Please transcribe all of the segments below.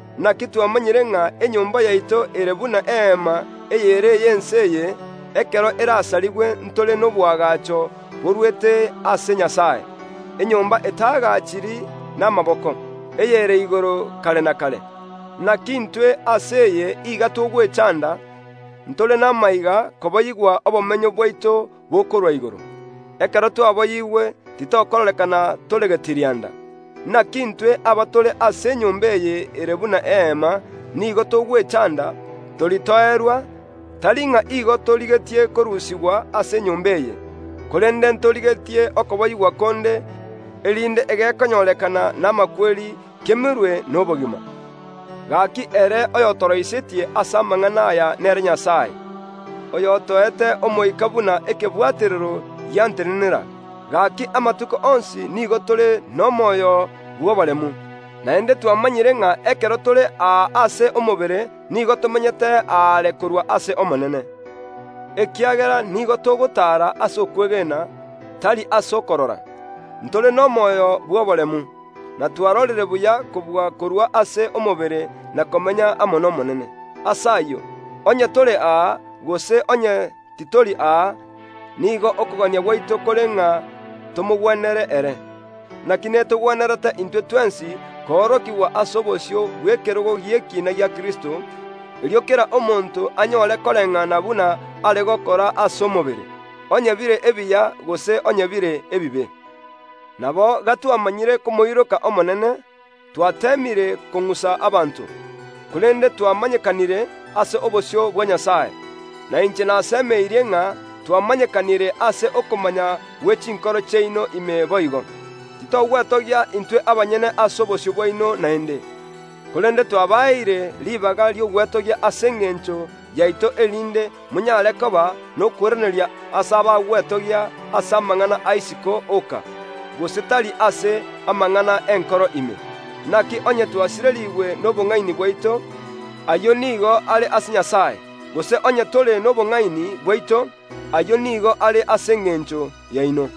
Naki twamanyire ng’a enyomba yaito ere buna eema eyere ey’ense eye, ekero erasarigwe ntore noboagacho borwete ase Nyasae, enyomba etaagachiri namaboko, eyere igoro kare na kare. Naki intwe ase enyomba eye iga togwechanda, ntore namaiga koboyigwa obomenyo bwaito aaria igoro. Ekero twaboyigwe titokororekana tore getirianda. Naki intwe, abatore ase enyomba eye ere buna eema, nigo togwechanda, toritoerwa, tari ng’a igo torigetie korusigwa ase enyomba eye, korende ntorigetie okoboyigwa konde, erinde egekonyorekana namakweri kemerwe nobogima. Gaki ere oyotoroisetie ase amang’ana aya nere Nyasae, oyotoete Omoika buna ekebwaterero giantenenera. Gaki amatuko onsi nigo tore nomoyo bw’oboremu, naende twamanyire ng’a ekero tore aa ase omobere nigo tomenyete aare korwa ase Omonene, ekiagera nigo togotaara ase okwegena, tari ase okorora. Ntore nomoyo bw’oboremu, na twarorire buya kobua korua ase omobere na komenya amo n’Omonene. Ase ayio, onye tore aa, gose onye titori aa, nigo okogania gwaito kore ng’a tomogwenere ere. Naki netogwenerete intwe twensi koorokigwa ase obosio bw’ekerogo gi’ekina gia Kristo; erio kera omonto anyore koreng’ana buna are gokora ase omobere, onye bire ebiya gose onye bire ebibe. Nabo gatwamanyire komoiroka Omonene, twateemire kong’usa abanto; korende twamanyekanire ase obosio bwa Nyasae, na inche nasemeirie ng’a twamanyekanire ase okomanya gwe chinkoro chiaino ime boigo. Titogwetogia intwe abanyene ase obosio bwaino naende, korende twabaeire ribaga ri’ogwetogia ase engencho yaito erinde monyare koba nokoiraneria ase abagwetogia ase amang’ana a isiko oka, gose tari ase amang’ana y’enkoro ime. Naki onye twasirerigwe nobong’aini bwaito, ayio nigo are ase Nyasae; gose onye tore nobong’aini bwaito, ayio nigo are ase engencho yaino.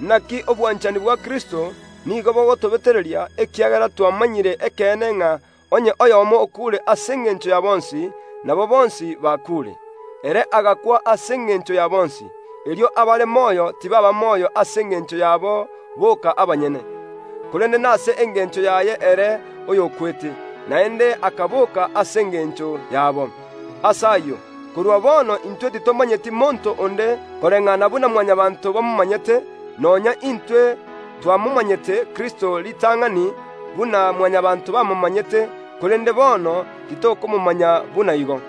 Naki obwanchani bwa Kristo nigo bogotobetereria, ekiagera twamanyire ekeene ng’a onye oyomo okuure ase engencho ya bonsi, nabo bonsi bakuure. Ere agakwa ase engencho ya bonsi, erio abare moyo tibaaba moyo ase engencho yabo boka abanyene, korende nase engencho yaye ere oyokwete, naende akaboka ase engencho yabo. Ase ayio, korwa bono intwe titomanyeti monto onde koreng’ana buna Mwanyabaanto bamomanyete; nonya intwe twamomanyete Kristo ritang’ani buna Mwanyabaanto bamomanyete, korende bono titokomomanya buna igo.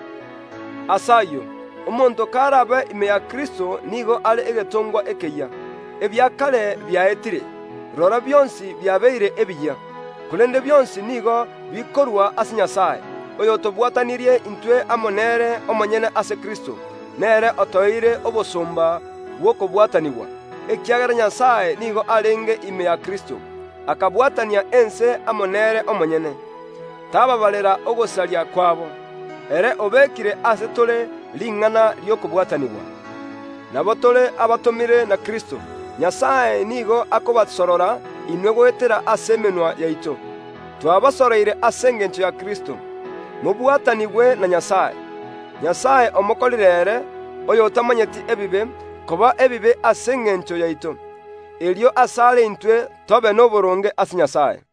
Ase ayio, omonto karabe ime ya Kristo nigo are egetongwa ekeyia; ebia kare biaetire, rora bionsi biabeire ebiyia. Korende bionsi nigo bikorwa ase Nyasae, oyotobwatanirie intwe amo nere omonyene ase Kristo, nere otoeire obosomba bw’okobwatanigwa, ekiagera Nyasae nigo arenge ime ya Kristo, akabwatania ense amo nere omonyene, tabaabarera ogosaria kwabo; ere obekire ase tore ring’ana ri’okobwatanigwa. Nabo tore abatomire na Kristo; Nyasae nigo akobasorora inwe goetera ase emenwa yaito. Twabasoroire ase engencho ya Kristo: Mobwatanigwe na Nyasae. Nyasae omokorire ere, oyotamanyeti ebibe, koba ebibe ase engencho yaito, erio asare intwe tobe noboronge ase Nyasae.